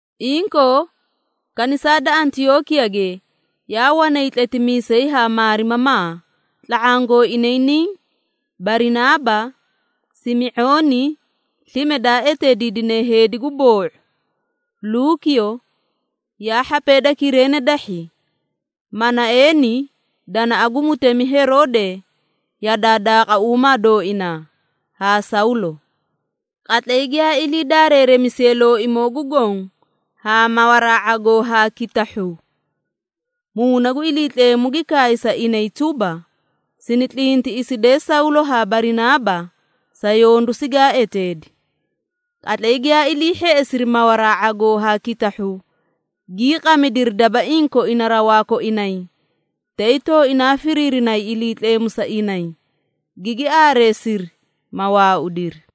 Inkoo, Kanisaa da Antiyookiyage yaa wanay tletimiisee haa maarimamaa, tla⁄aã gooinay niĩ, Barinaaba, Simi⁄ooni slime daa eteediidine “Heedi gu boo⁄u,” Luukiyo yaa hhapee da Kireene dahhi, Manaeeni (danaꞌa gu mutemi Heroode yadaa daaqauumaa dooinaa) haa Sawlo. Qatlay giyaa ilii daareeremisiyee Looimoo gu Goõ haa mawaraa ⁄agoo haa kitahhuu, Muuna gu Iliitleemu gi kaay sa inay tuba, “Sini tlintiꞌisidee Sawlo haa Barinaaba sa yondu sigaa eteedi.” Qatlay giyaa ilii hheꞌesiri mawaraa ⁄agoo haa kitahhuu, gii qamidiri dabaiĩ koina rawaa koinay, tay tooinaa firiirinay Iliitleemu sa inay, gigi aareesiri, ma waaudiri.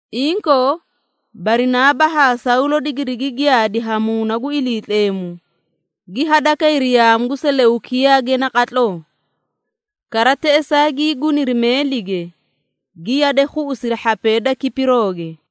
Inkoo, Barinaaba haa Sawlo digirigi giyaadi haa Muuna gu Iliitleemu, gi hadakayri yaamu gu Seleukiyaage naqatloo. Kara teꞌesaa gii guniri meelige, gi yade khuꞌusiri hhapee da Kipirooge.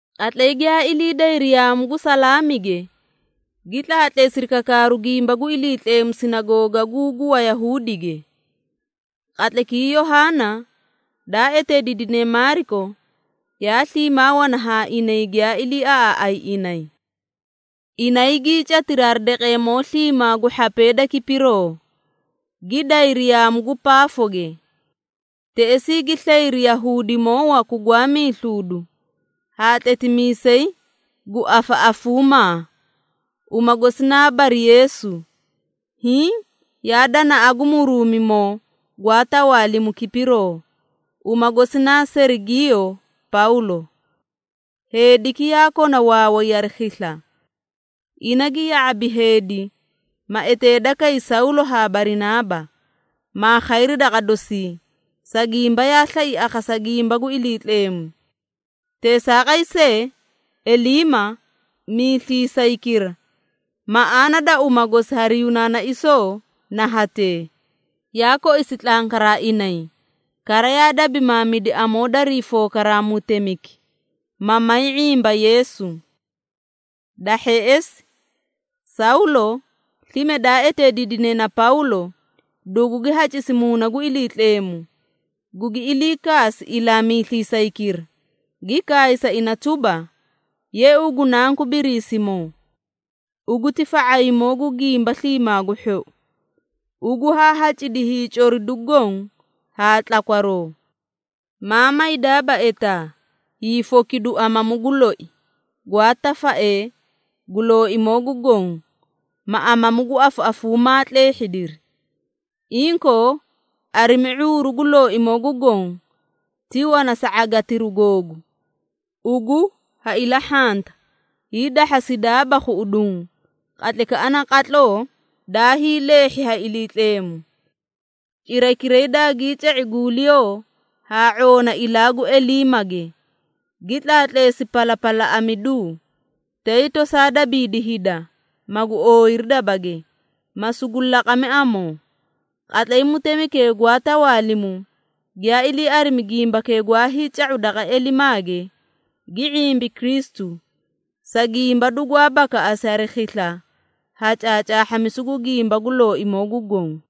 Qatlay giyaa ilii dayri yaamu gu Salaamige, gi tlaatleesiri kakaaru gimba gu Iliitleemu sinagoogaguu gu Wayahuudige. Qatlaykii Yohaana, daa eteediidine Maariko, yaa sliimaa wana haa inay giyaa iliiaꞌaaꞌay inay. Inay gii catiri hari daqeemoo sliimaa gu hhapee da Kipiroo, gi dayri yaamu gu Paafoge. Teꞌesii gi slayri Yahuudimoo waku gwaa miisluudu haa tletimiisay gu afaꞌafuumaa, uma gosi naa Bari-Yeesu, hiĩ yaa danaꞌa gu Muruumimoo gwaa tawaalimu Kipiroo, uma gosi naa Serigiiyo Pawlo. Heediki yaa kona waaway hari khisla. Ina gi ya⁄abi heedi, ma eteeda kay Sawlo haa Barinaaba, maa khayri daqa dosii, sa gimba yaa slai akhasa gimba gu Iliitleemu. Teesaaqay see Eliima, miisliisaykira (maꞌaana da uma gosi hari Yunaanaisoo na hatee), yaa koisi tlankaraa inay, kara yaa dabimaamidi amoo darii fookaraa mutemiki, ma may ⁄imba Yeesu. Da hheꞌesi Sawlo, slime daa eteediidine na Pawlo, dugugi hacisi Muuna gu Iliitleemu, gugi ilii kaasi ilaa miisliisaykira, gi kaay sa ina tuba, “Ye ugu nanku Biriisimoo! Ugu ti fa⁄aymoo gu gimba sliimaa gu hhou! Ugu haa hacidi hiicoridu goõ haa tlakwaroo. Maa maydaaba etaa, hiifokidu amamu gu loi, gwaa tafaee gu Looimoo gu Goõ, ma amamu gu afaꞌafuumaa tleehhidiri! Inkoo, arimi ⁄uuru gu Looimoo gu Goõ ti wana sa ⁄agitiru googu, ugu ha ilahhanta, hiidahhasidaaba khuꞌuduũ qatlaykaꞌa naqatloo daa hiileehhi ha Iliitleemu.” Cirakiray daagii ca⁄i guuliyoo haa ⁄oona ilaa gu Eliimage, gi tlaatleesi palapalaꞌamiduu, tay tosaa dabiidi hida, magu ooyiri dabage, ma sugu laqami amoo. Qatlay mutemikee gwaa tawaalimu, giyaa ilii arimi gimbakee gwaa hiica⁄u daqa Elimaage, gi ⁄imbi Kristu, sa gimba dugwaa bakaꞌasi hari khisla ha caacaahhamisu gu gimba gu Looimoo gu Goõ.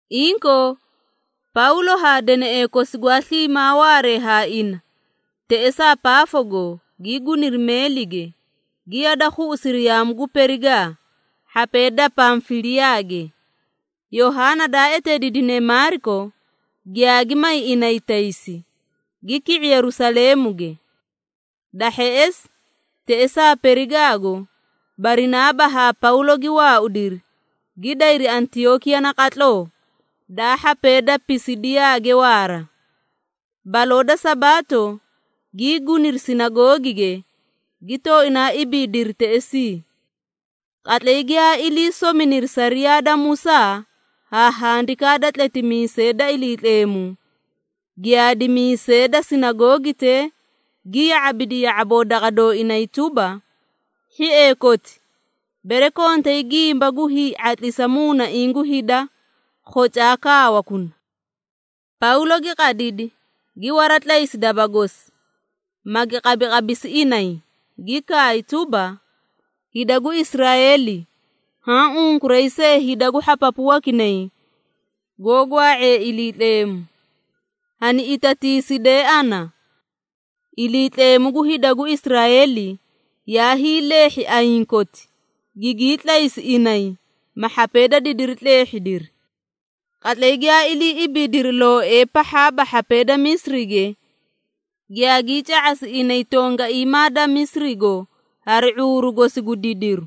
Inkoo Pawlo haa deneꞌee kosi gwaa sliimaa waaree haa ina, teꞌesaa Paafogo gii guniri meelige, gi yada khuꞌusiri yaamu gu Perigaa, hhapee da Pamfiliyaage. Yohaana daa eteediidine Maariko, giyaagi may inay taysi, gi ki⁄i Yerusaleemuge. Da hheꞌesi teꞌesaa Perigaago, Barinaaba haa Pawlo gi waaudiri, gi dayri Antiyookiya naqatloo, daa hhapee da Pisidiyaage waara. Baloo da Sabaato gii guniri sinagoogige, gi tooinaa ibiidiri teꞌesii. Qatlay giyaa ilii sominiri sariyaa da Musaa haa handikaa da tletimiisee da Iliitleemu, giyaadimiisee da sinagoogitee gi ya⁄abidi ya⁄aboo daqa dooinay tuba, “Hhiee koti! Bere kontay gimba gu hii⁄atlisa muunaiĩ gu hida, khocaa kaawakuna.” Pawlo gi qadidi, gi waratlaysi daba gosi, magi qabiqabisi inay, gi kaay tuba, “Hida gu Israeeli, haã unkuray see hida gu hhapapu wakinay goó gwaa⁄ee Iliitleemu, hani itatiisidee ana! Iliitleemu gu hida gu Israeeli yaa hiileehhi ayiĩ koti, gigii tlaysi inay, ma hhapee da didiri tleehhidiri. Qatlay giyaa ilii ibiidiri looee pahhaaba hhapee da Misirige, giyaagii ca⁄asi inay tongaiimaa da Misirigo hari ⁄uuru gosi gu didiru.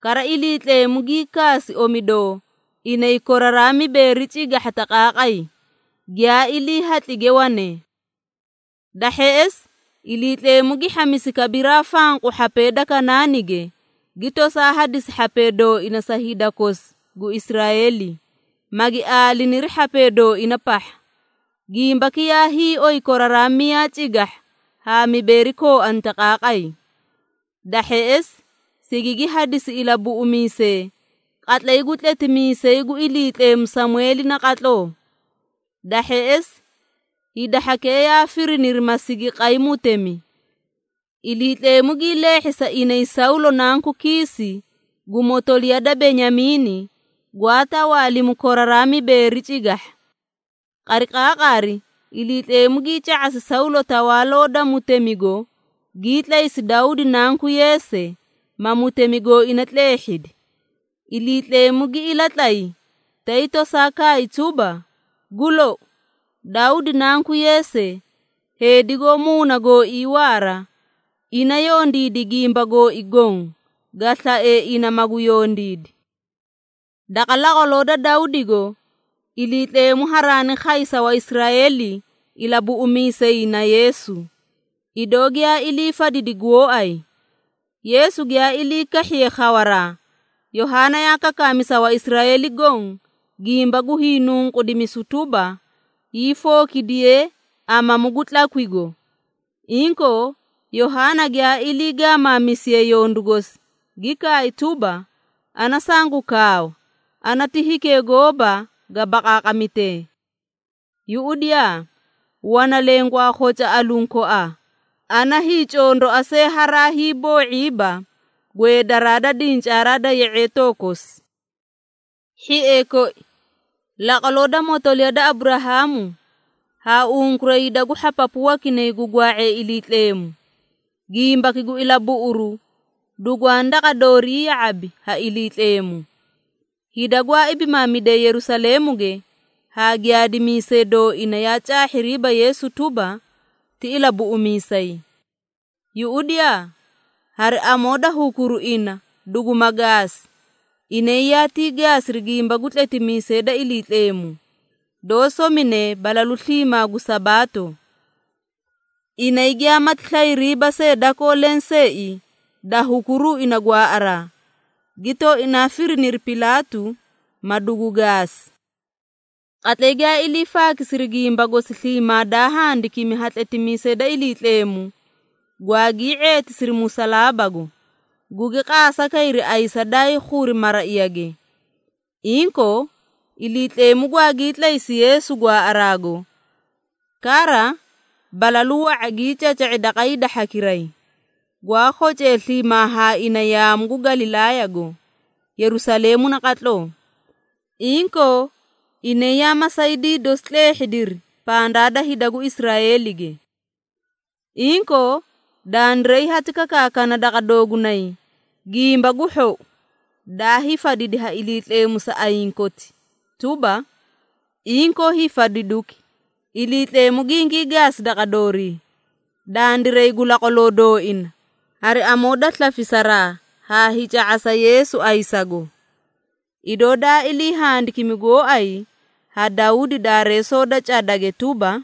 Kara Iliitleemu gii kaasi omidoo inay koraraa mibeeri cigahha taqaaqay, giyaa ilii hatlige wanee. Da hheꞌesi Iliitleemu gi hhamisi kabiraa fanqu hhapee da Kanaanige, gi tosaa hadisi hhapee dooina sa hida kosi gu Israeeli, magi aaliniri hhapee dooina pahha. Gimbaki yaa hiioy koraraa miyaa cigahha haa mibeeri kooani taqaaqay. Da hheꞌesi, sigigi hadisi ilabuꞌumiisee qatlay gu tletimiisay gu Iliitleemu Samweeli naqatloo. Da hheꞌesi, hida hhakee yaa firiniri ma sigi qay mutemi. Iliitleemu gii leehhi sa inay Sawlo nanku Kiisi, gu motoliya da Benyamiini, gwaa tawaalimu koraraa mibeeri cigahha. Qariqaaqari Iliitleemu gii ca⁄asi Sawlo tawaaloo da mutemigo, gii tlaysi Dawdi nanku Yeese, ma mutemi gooina tleehhidi. Iliitleemu gi ilatlay, tay tosaa kaay tuba, ‘Gu lou, Dawdi nanku Yeese, heedi goó muuna gooii waara, ina yondiidi gimba gooi goõ, ga slae ina magu yondiidi.’ Daqa laqwaloo da Dawdigo, Iliitleemu haraani khay sa Waisraeeli Ilabuꞌumiisay na Yeesu, idoo giyaa ilii fadidi gooay. Yeesu giyaa ilii kahhiye khawaraa, Yohaana yaa kakaami sa Waisraeeli goõ gimba gu hiinunqudimisu tuba, hiifookidiyee amamu gu tlakwigo. Inkoo, Yohaana giyaa ilii gaamaamisiye yondu gosi, gi kaay tuba, ‘Ana sangu kaawa, ana ti hikee gooba ga baqaaqamitee! Yuꞌudiyaa! Wana leẽ gwaa khoca aluũ koaa, ana hiicondoa see haraa hiiboo⁄iiba gweedaraa da dincaaraa da ye⁄eetoo kosi.’ Hhiee koi, laqwaloo da motoliya da Aburahaamu haa unkuray hida gu hhapapu wakinay gu gwaa⁄ee Iliitleemu, gimbaki gu ilabuꞌuru dugwaani daqa doorii ya⁄abi ha Iliitleemu. Hida gwaa ibimaamidee Yerusaleemuge haa giyaadimiisee dooina yaa caahhiriiba Yeesu tuba, ti Ilabuꞌumiisay. Yuꞌudiyaa, hari amoo da hukuru ina duguma gaasi, inay yaatii gaasiri gimba gu tletimiisee da Iliitleemu, doó somine balalu sliimaa gu Sabaato. Inay giyaamati slayriiba see dakoo lenseei da hukuruu ina gwaaꞌaraa, gi tooinaa firiniri Pilaatu, ma dugu gaasi. Qatlay giyaa ilii faakisiri gimba gosi sliimaa daa handikimi ha tletimiisee da Iliitleemu, gwaagii ⁄eetisiri musalaabago, gugi qaasa kayri ayisa daay khuri maraiyage. Inkoo, Iliitleemu gwaagii tlaysi Yeesu gwaaꞌaraago! Kara, balalu wa⁄a gii caca⁄i daqa hida hhakiray, gwaa khocee sliimaa haa ina yaamu gu Galilaayago, Yerusaleemu naqatloo. Inkoo inay yaa masaydii dosi tleehhidiri pandaa da hida gu Israeelige. Inkoo dandiray hati kakaakana daqa doogunay Gimba gu Hhou, daa hiifadidi ha Iliitleemu sa ayiĩ koti tuba, inkoo hiifadiduki, Iliitleemu gingii gaasi daqa doori, dandiray gu laqwaloo dooina, hari amoo da slafisaraa haa hiica⁄asa Yeesu ayisago. Idoo daa ilii handikimi gooay ha Dawdi Daareesoo da cadage tuba,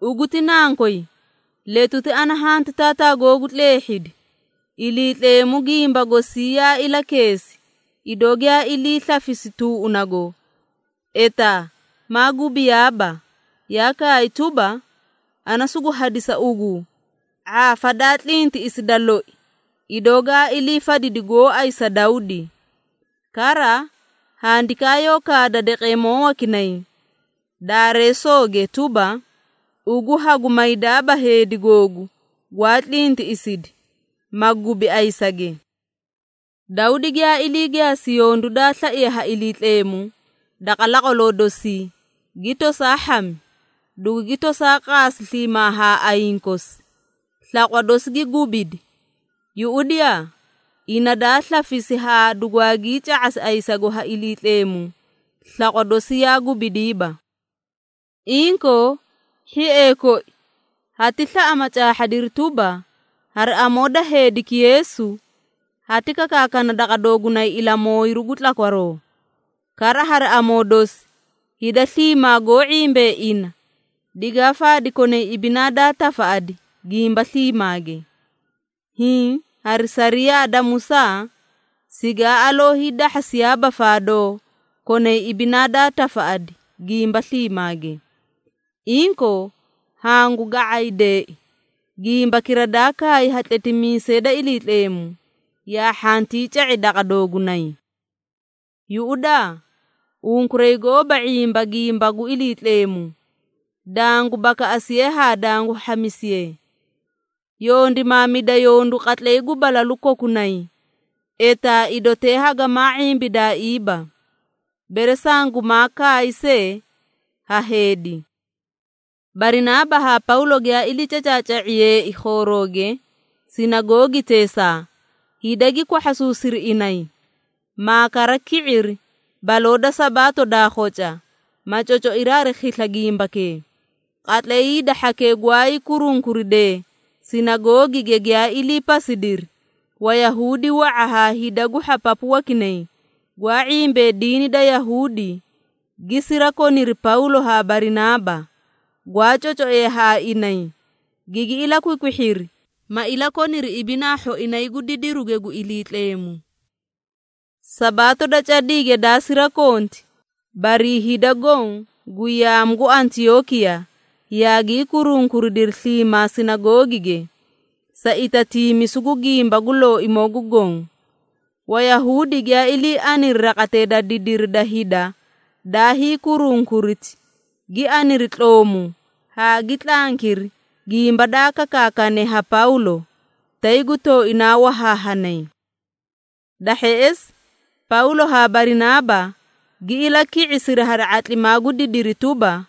‘Ugu ti nankoy, letuti ana hanti taataa googu tleehhidi.’ Iliitleemu gimba gosii yaa ilakeesi, idoo giyaa ilii slafisi tuuꞌunago, etaa maa gubiyaaba, yaa kaay tuba, ‘Ana sugu hadisa ugu, ⁄aafa daa tlintiꞌisi da loi, idoo gaa ilii fadidi gooay sa Dawdi.’ Kara, handikaa yoó kaada daqeemoo wakinay Daareesooge tuba, ‘Ugu hagu maydaaba Heedi Googu Gwaa tlintiꞌisidi, ma gubi ayisage.’ Dawdi giyaa ilii gaasi yondu daa slaiye ha Iliitleemu, daqa laqwaloo dosii, gi tosaa hhami, dugugi tosaa qaasi sliimaa haa ayiĩ kosi, slaqwa dosi gi gubidi. Yuꞌudiyaa, ina daa slafisi haa dugwaagii ca⁄asi ayisago ha Iliitleemu, slaqwa dosi yaa gubidiiba. Inkoo, hhiee koi hati slaꞌa ma caahhadiri tuba, hari amoo da heediki Yeesu, hati kakaakana daqa doogunay ilamooyiru gu tlakwaroo. Kara hari amoo dosi, hida sliimaa goó ⁄imbee ina, digaa faadi konay ibinaa daa tafaꞌadi gimba sliimaage, hiĩ hari sariyaa da Musaa sigaa aloo hiidahhasiyaaba faadoo konay ibinaa daa tafaꞌadi gimba sliimaage. Inkoo, hangu ga⁄aydeei, gimbakira daa kaay ha tletimiisee da Iliitleemu, yaa hhantii ca⁄i daqa doogunay: ‘Yuꞌudaa, unkuray gooba ⁄imba gimba gu Iliitleemu, dangu bakaꞌasiye haa dangu hhamisiye! Yondimaamida yondu qatlay gu balalu kokunay, etaa idotee hagamaa ⁄imbidaaiiba, bere sangumaa kaay see ha heedi.’” Barinaaba haa Pawlo giyaa ilii cacaaca⁄iyeei khoorooge sinagoogiteesaa, hida gi kwahhasuusiri inay, maa kara ki⁄iri baloo da Sabaato daa khoca, ma cocoiri hari khisla gimbakee. Qatlay hida hhakee gwaay kurunkuridee sinagoogige giyaa ilii pasidiri, Wayahuudi wa⁄a haa hida gu hhapapu wakinay, gwaa ⁄imbee diini da Yahuudi, gi sirakoniri Pawlo haa Barinaaba, gwaa cocoee haa inay, gigi ilakwikwihhiri, ma ilakoniri ibinaa hhoinay gu didiruge gu Iliitleemu. Sabaato da cadiige daa sirakonti, barii hida goõ gu yaamu gu Antiyookiya yaagii kurunkuridiri sliimaa sinagoogige, sa itatiimisu gu gimba gu Looimoo gu Goõ. Wayahuudi giyaa ilii aniri raqatee da didiri da hida daa hiikurunkuriti, gi aniri tloomu haa gi tlankiri gimba daa kakaakane ha Pawlo, tay gu tooinaa wahaahanay. Da hheꞌesi, Pawlo haa Barinaaba gi ilaki⁄isiri hari ⁄atlimaa gu didiri tuba,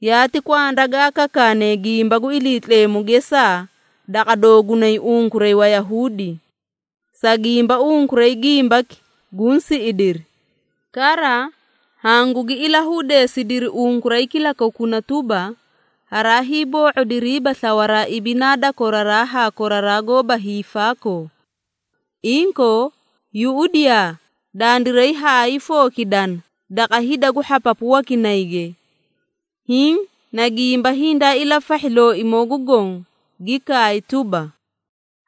“Yaati kwanda gaa kakaane gimba gu Iliitleemu gesaa daqa doogunay unkuray Wayahuudi. Sa gimba unkuray gimbaki guũ siꞌidiri, kara hangugi ilahudeesidiri unkuray kilakokuna tuba, haraa hiiboo⁄odiriiba slawaraa ibinaa da koraraa haa koraraa goóba hiifaakoo. Inkoo, yuꞌudiyaa dandiray hayii fookidana daqa hida gu hhapapu wakinayge. Hiĩ na gimba hindaa ilafahhi Looimoo gu Goõ, gi kaay tuba,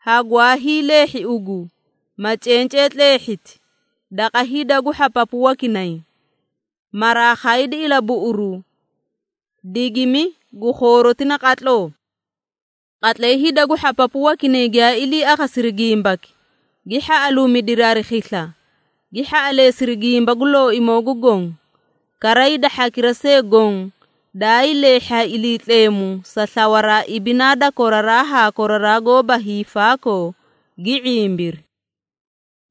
‘Hagwaa hiileehhi ugu, ma cencee tleehhiti, daqa hida gu hhapapu wakinay, maraa khaydi ilabuꞌuru, digimi gu khooroti naqatloo.’” Qatlay hida gu hhapapu wakinay giyaa ilii akhasiri gimbaki, gi hhaꞌaluumidiri hari khisla, gi hhaꞌaleesiri gimba gu Looimoo gu Goõ. Kara hida hhakira see goõ daayii leehhi ha Iliitleemu sa slawaraa ibinaa da koraraa haa koraraa goóba hiifaakoo, gi ⁄imbiri.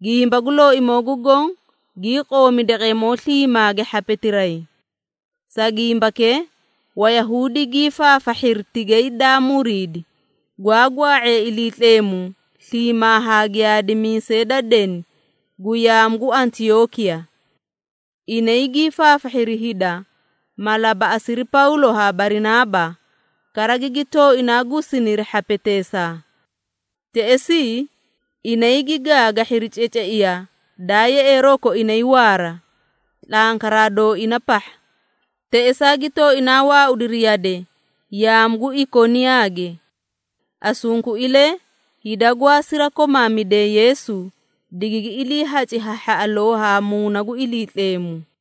Gimba gu Looimoo gu Goõ gii qoomi daqeemoo sliimaage hhapetiray. Sa gimbakee, Wayahuudi gii faafahhiri tigay daa muriidi, gwaa gwaa⁄ee Iliitleemu sliimaa haa giyaadimiisee da deni gu yaamu gu Antiyookiya. Inay gii faafahhiri hida, ma labaꞌasiri Pawlo haa Barinaaba, kara gigi tooinaa gusiniri hhapeteesaa. Teꞌesii inay gi gaagahhiri ceceiya daa yeꞌeeroo koinay waara, tlankaraa dooina pahha. Teꞌesaa gi tooinaa waaudiri yade yaamu gu Ikoniyaage. Asunkuilee hida gwaa sirakomaamidee Yeesu, digigi iliihaci ha hhaꞌaloo haa Muuna gu Iliitleemu.